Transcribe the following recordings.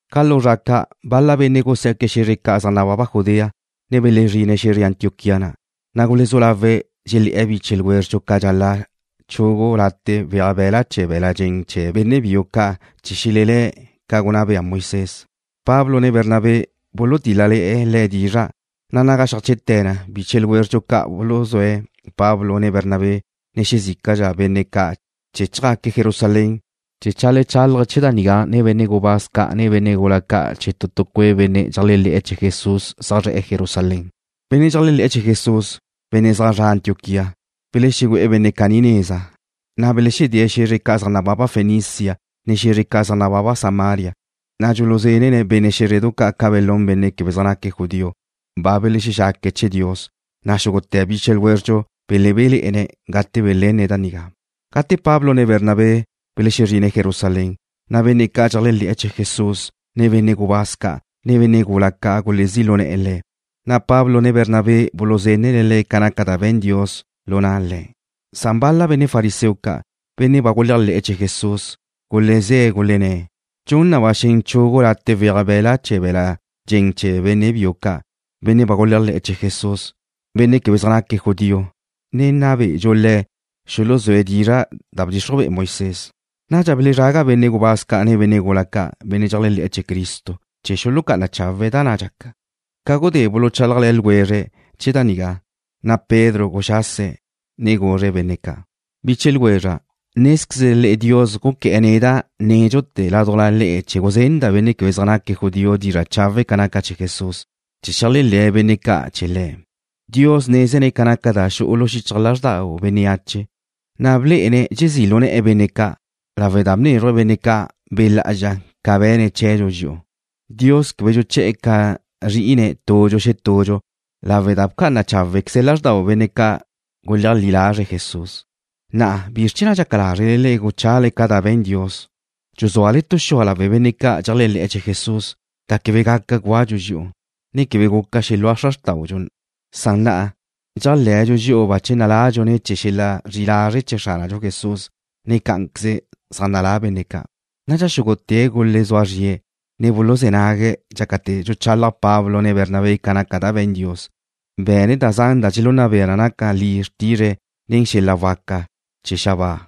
Ca lu zra ca', bal-la benne' gusiá'que̱' xe̱zre ca' zaj nababa Judea, ne belezrine̱' xe̱zre Antioquía na', na' gulezú lawe̱' dxelé̱'e̱ biche ljwézredxu ca' dxal-la' chugu late' weaj be̱la' chee̱ be̱l-la' dxen chee̱ benne' biu ca' chee̱ xelelé̱', ca gunná bea Moisés. Pablo ne Bernabé bulutíl-lale̱'e̱ le̱' dizra', na' naga xeajche'te̱ na, biche ljwézredxu ca' buluzúe̱' Pablo, ne Bernabé, ne xezícala benne' ca' chee̱ chjaque̱' Jerusalén chee̱ cheajlechálaje̱' chee̱ da nigá nen benne' gubáz ca', ne benne' gula ca' chee̱ cue' benne' dxeléajle̱'e̱ chee̱ Jesús zaj zre̱'e̱ Jerusalén. Benne' dxeléajle̱'e̱ chee̱ Jesús, benne' zaj zre̱'e̱ Antioquía, belexegu'e̱ benne' caní neza, na' belexedée̱' xe̱zre ca' zaj nababa Fenicia, ne xe̱zre ca' zaj nababa Samaria, na' dxuluzenne̱' benne' xé̱zredu ca' ca belún benne' quebe zaj naque̱' judío, ba belexexaque̱' chee̱ Dios, na' xúgute̱ biche ljwézredxu belebéle̱'e̱ne̱' gate belenne̱' da nigá. Gate Pablo ne Bernabé belexezrine̱' Jerusalén, na' benne' ca' dxeléajle̱'e̱ chee̱ Jesús ne benne' gubáz ca', ne benne' gula ca' gulezí' lu ne̱'e̱ le̱', na' Pablo ne Bernabé buluzenne̱' le̱' ca naca da be̱n Dios lu na' le̱'. Bal-la benne' fariseo ca', benne' ba guléajle̱'e̱ chee̱ Jesús, gulezé̱' gulenné̱': ―Dxun na ba xen chugu late' weaj be̱la' chee̱ be̱l-la' dxen chee̱ benne' biu ca', benne' ba guléajle̱'e̱ chee̱ Jesús, benne' quebe zaj naque̱' judío, ne nna be'edxu le̱' xuluzúe̱' dizra' da bdxixruj be'e Moisés. Nadxa belezraga benne' gubáz ca' ne benne' gula ca', benne' dxeléajle̱'e̱ chee̱ Cristo, chee̱ xulucá'ana chawe̱' da na' dxaca. Ca gudé buluchálajle̱ ljwezre̱' chee̱ da nigá, na' Pedro guxase̱', ne guzre̱' benne' ca': ―Biche ljwezra', nézquezle le'e Dios guqué̱'e̱ neda' nédxute̱ ládujla le'e chee̱ guzenda' benne' quebe zaj naque̱' judío dizra' chawe' ca naca chee̱ Jesús, chee̱ xeléajle̱ benne' ca' chee̱ Le̱'. Dios nézene̱' ca naca da xu'u lu xichaj lázxdau bénneache, na' blé'ene̱' dxezí' lu ne̱'e̱ benne' ca', lawe' da bnézruje̱' benne' ca' Be' Lá'azxa ca be̱ne̱' chee̱dxu dxi'u. Dios quebe dxuché̱'e̱ ca zrí'ine̱' tudxu xetudxu lawe' da bca'ana cháwequeze̱' lázxdau benne' ca' guleajlí lazre̱' Jesús. Na'a, ¿bizr chee̱ na' dxaca lázrele le'e guchale ca da ba be̱n Dios, dxuzúale tu xua' lawe' benne' ca' dxeléajle̱'e̱ chee̱ Jesús, da quebe gaca gúadxu dxi'u, ne quebe guca xelúa xra xrtáudxu na? Na'a, dxéajle̱dxu dxi'u bache naladxu ne̱ chee̱ xel-la' zri'i lazre' chee̱ Xránadxu Jesús, ne cá'anqueze zaj nalá benne' ca'. Nadxa xúgute̱' gulezúa zrie̱', ne buluzé̱ nague̱' dxácate̱ dxuchalaj Pablo ne Bernabé ca naca da be̱n Dios, be̱ne̱' da zan da dxelunna bea na naca li xrtizre̱' nen xel-la' waca ca' da za xabáa,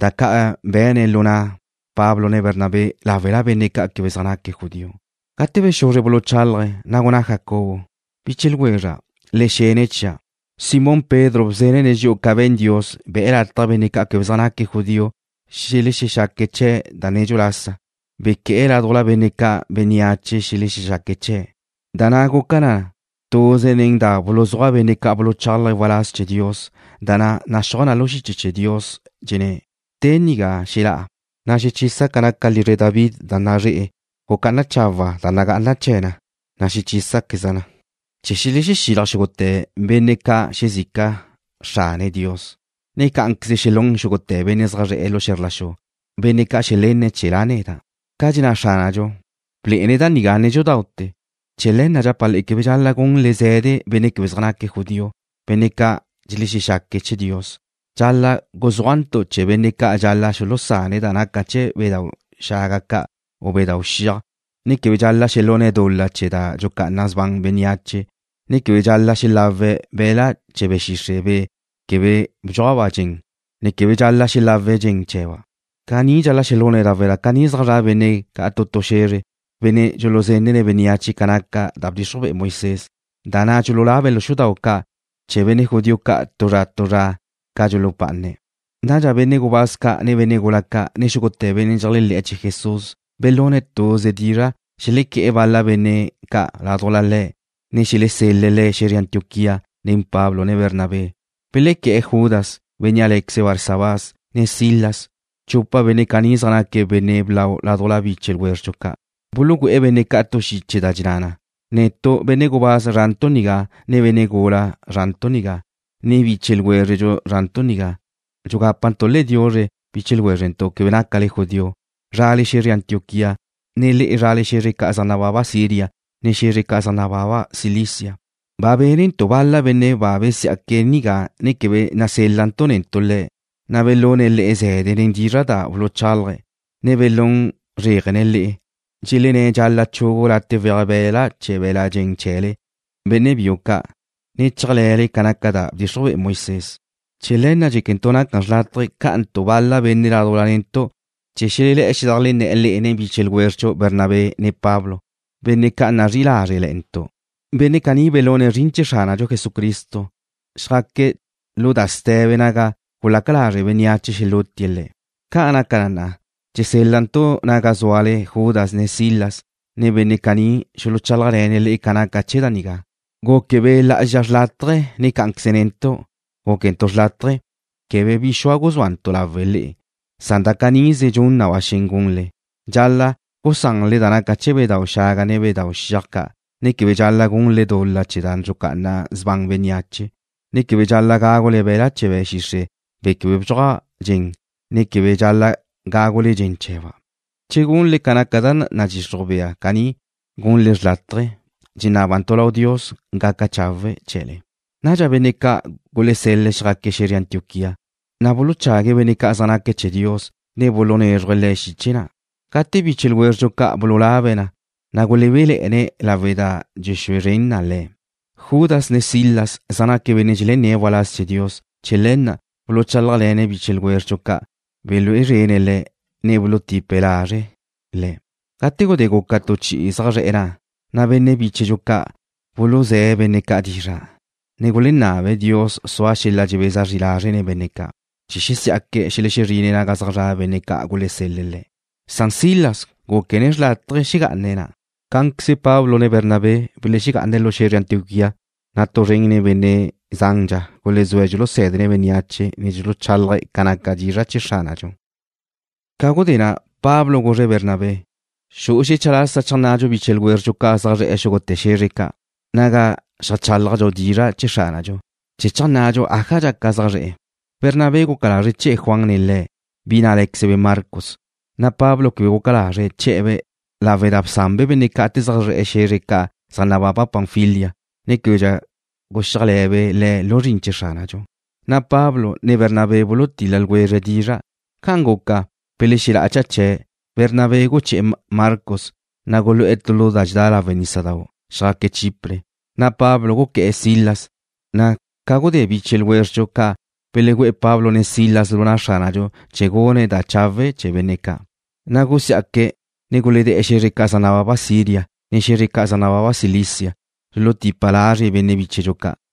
da ca' be̱ne̱' lu na' Pablo ne Bernabé láwela benne' ca' quebe zaj naque̱' judío. Gate bexuzre buluchálaje̱', na' gunná Jacobo: ―Biche ljwezra', le xene chia'. Simón Pedro bzenne̱' dxi'u ca be̱n Dios, be̱'e̱ lataj benne' ca' quebe zaj naca judío xelexexaque̱' chee̱' da nedxu lasa, bequé̱'e̱ ládujla benne' ca' bénneache xelexexaque̱' chee̱'. Da na' guca naca na tuze nen da buluzúaj benne' ca' buluchálaje̱' waláz chee̱ Dios, da na' naxúaj na lu xiche chee̱ Dios, dxenné̱': Te nigá xelá'a na' xechisa' ca naca lizre David da nazre'e. Gucá'ana chawa' da nagá'ana chee̱ na, na' xechísaqueza' na, chee̱ xelexílaj xúgute̱ benne' xezica ca' Xrane̱' Dios, ne cá'anqueze xelún xúgute̱ benne' zaj zra' xe̱zr la xu ca', benne' ca' xelenne̱' chee̱ La' neda'. Ca' dxenná Xránadxu, blé'ene̱' da nigá nédxudaute̱. ’Chee̱ le̱ na' dxapa' le'e quebe dxal-la' gunle ze̱de benne' quebe zaj naque̱' judío, benne' ca' dxelexexaque̱' chee̱ Dios. Dxal-la' guzúajntu' chee̱ benne' ca' dxal-la' xulusane̱' da naca chee̱ bedáu' xaga ca' u bedáu' xiaj, ne quebe dxal-la' xelune̱' dul-la chee̱ da dxucá'ana sban bénneache, ne quebe dxal-la' xelawe̱' be̱la' chee̱ be̱ xixre', be̱ quebe bdxuaj dxen, ne quebe dxal-la' xelawe̱' dxen chee̱ba'. Caní dxal-la' xelune̱' lawe' da ca ni'i zaj zra' benne' tu tu xe̱zre, benne' dxuluzenne̱' bénneache ca naca da bdxixruj bea Moisés, da na' dxululabe̱' lu xudau' ca' chee̱ benne' judío ca' tu tu zra ca' dxulupá'ane̱'. Nadxa benne' gubáz ca', ne benne' gula ca', ne xúgute̱ benne' dxeléajle̱'e̱ chee̱ Jesús belune̱' tuze dizra' xelequé̱'e̱ bal-la benne' ca' ládujla le̱' ne xelesel-le̱' le̱' xe̱zre Antioquía nen Pablo, ne Bernabé. Belequé̱'e̱ Judas, bénnea' lé̱queze̱' Barsabás, ne Silas. Chupa benne' caní zaj naque̱' benne' blau ládujla biche ljwézredxu ca'. Bulugüé̱'e̱ benne' ca' tu xiche da dxenná na: “Netu', benne' gubáz zrantu' nigá, ne benne' gula zrantu' nigá, ne biche ljwézrele zrantu' nigá, dxugápantu' le'e diuzre, biche ljwézrentu' quebe nácale judío, zrale xe̱zre Antioquía, ne le'e zrale xe̱zre ca' zaj nababa Siria, ne xe̱zre ca' zaj nababa Cilicia. Ba bénentu' bal-la benne' ba besiá'que̱' nigá, ne quebe nasél-lantu' netu' le̱', na' belune̱' le'e ze̱de nen dizra' da buluchálaje̱', ne belún zréajene̱' le'e, dxelenné̱' dxal-la' chugu late' weaj be̱la' chee̱ be̱l-la' dxen chee̱le, benne' biu ca', ne chéajle̱le ca naca da bdxixruj be'e Moisés. Chee̱ le̱ na' dxéquentu' naca xrlátaje cá'antu' bal-la benne' ládujla netu' chee̱ xelelé̱'e̱ xedajlenné̱'e̱ le'e nen biche ljwézredxu Bernabé ne Pablo, benne' ca' nazrí'i lázrele̱'e̱ntu'. Benne' caní belune̱' zrin chee̱ Xránadxu Jesucristo, xjaque̱' lu da ste̱be naga gulaca lazre' bénneache xelútie̱' le̱'. Ca' naca na, dxesél-lantu' naga zúale Judas ne Silas, na' benne' caní xuluchálajle̱ne̱' le'e ca naca chee̱ da nigá. Guque Be' Lá'azxa xrlátaje, ne cá'anqueze netu' gúquentu' xrlátaje quebe bi xua' guzúantu' lawe' le'e, san da canize dxun na ba xen gunle. Dxal-la' gusanle da naca chee̱ bedáu' xaga, ne bedáu' xiaj ca', ne quebe dxal-la' gunle dul-la chee̱ da dxucá'ana sban bénneache, ne quebe dxal-la' gágule be̱la' chee̱ be̱ xixre', be̱ quebe bdxuaj dxen, ne quebe dxal-la' gágule dxen chee̱ba'. Che gunle ca naca da nadxixruj bea caní, gunle xrlátaje. Dxenábantu' lau Dios gaca chawe' chee̱le.” Nadxa benne' ca' gulesel-le̱' xjaque̱' xe̱zre Antioquía. Na' buluchague̱' benne' ca' zaj naque̱' chee̱ Dios, ne bulunézruje̱' le̱' xiche na'. Gate biche ljwézredxu ca' bululabe̱' na, na' gulebéle̱'e̱ne̱' lawe' da dxue zren na le̱'. Judas ne Silas zaj naque̱' benne' dxelenné̱' waláz chee̱ Dios. Chee̱ le̱ na' buluchálajle̱ne̱' biche ljwézredxu ca', belúe zrene̱' le̱', ne bulutipe̱' lazre' le̱'. Gate gudé guca tu chi'i zaj zre̱'e̱ na', na' benne' bíchedxu ca' buluzé̱' benne' ca' dizra', ne gulenabe̱' Dios sua xel-la' dxebeza zri lazre' nen benne' ca', chee̱ xesí'aque̱' xelexezrine̱' naga zaj zra' benne' ca' gulesel-le̱' le̱'. Silas gúquene̱' xrlátaje xegá'ane̱' na'. Cá'anqueze Pablo, ne Bernabé belexegá'ane̱' lu xe̱zre Antioquía, na' tu zren nen benne' zandxa gulezúe̱' dxulusé̱dene̱' bénneache, ne dxuluchálaje̱' ca naca dizra' chee̱ Xránadxu. Ca gudé na', Pablo guzre̱' Bernabé: ―Xu'u xecha lasa cheajnnadxu biche ljwézredxu ca' zaj zre̱'e̱ xúgute̱ xe̱zre ca' naga xeajchálajdxu dizra' chee̱ Xránadxu, chee̱ cheajnnadxu aja dxaca zaj zre̱'e̱. Bernabé guca lazre̱' che̱'e̱ Juan nen le̱', bi na' lé̱quezebe' Marcos, san Pablo quebe guxáza lazre̱' che̱'e̱-be' lawe' da bsanbe' benne' ca' gate zaj zre̱'e̱ xe̱zre ca' zaj nababa Panfilia, ne québedxa guxíajle̱be' le̱' lu zrin chee̱ Xránadxu. Na' Pablo, ne Bernabé bulutil-la ljwezre̱' dizra'. Ca'an guca, belexela'a cha chee̱'. Bernabé guché̱'e̱ Marcos, na' gulu'e̱ tu lu da dxedá lawe' nísadau', na' xjaque̱' Chipre. Na' Pablo guqué̱'e̱ Silas, na' ca gudé biche ljwézredxu ca' belegüe̱'e̱ Pablo ne Silas lu na' Xránadxu chee̱ gune̱' da chawe' chee̱ benne' ca', na' gusiá'que̱', ne guledée̱' xe̱zre ca' zaj nababa Siria, ne xe̱zre ca' zaj nababa Cilicia, na' bulutipe̱' lazre' bi bíchedxu ca'.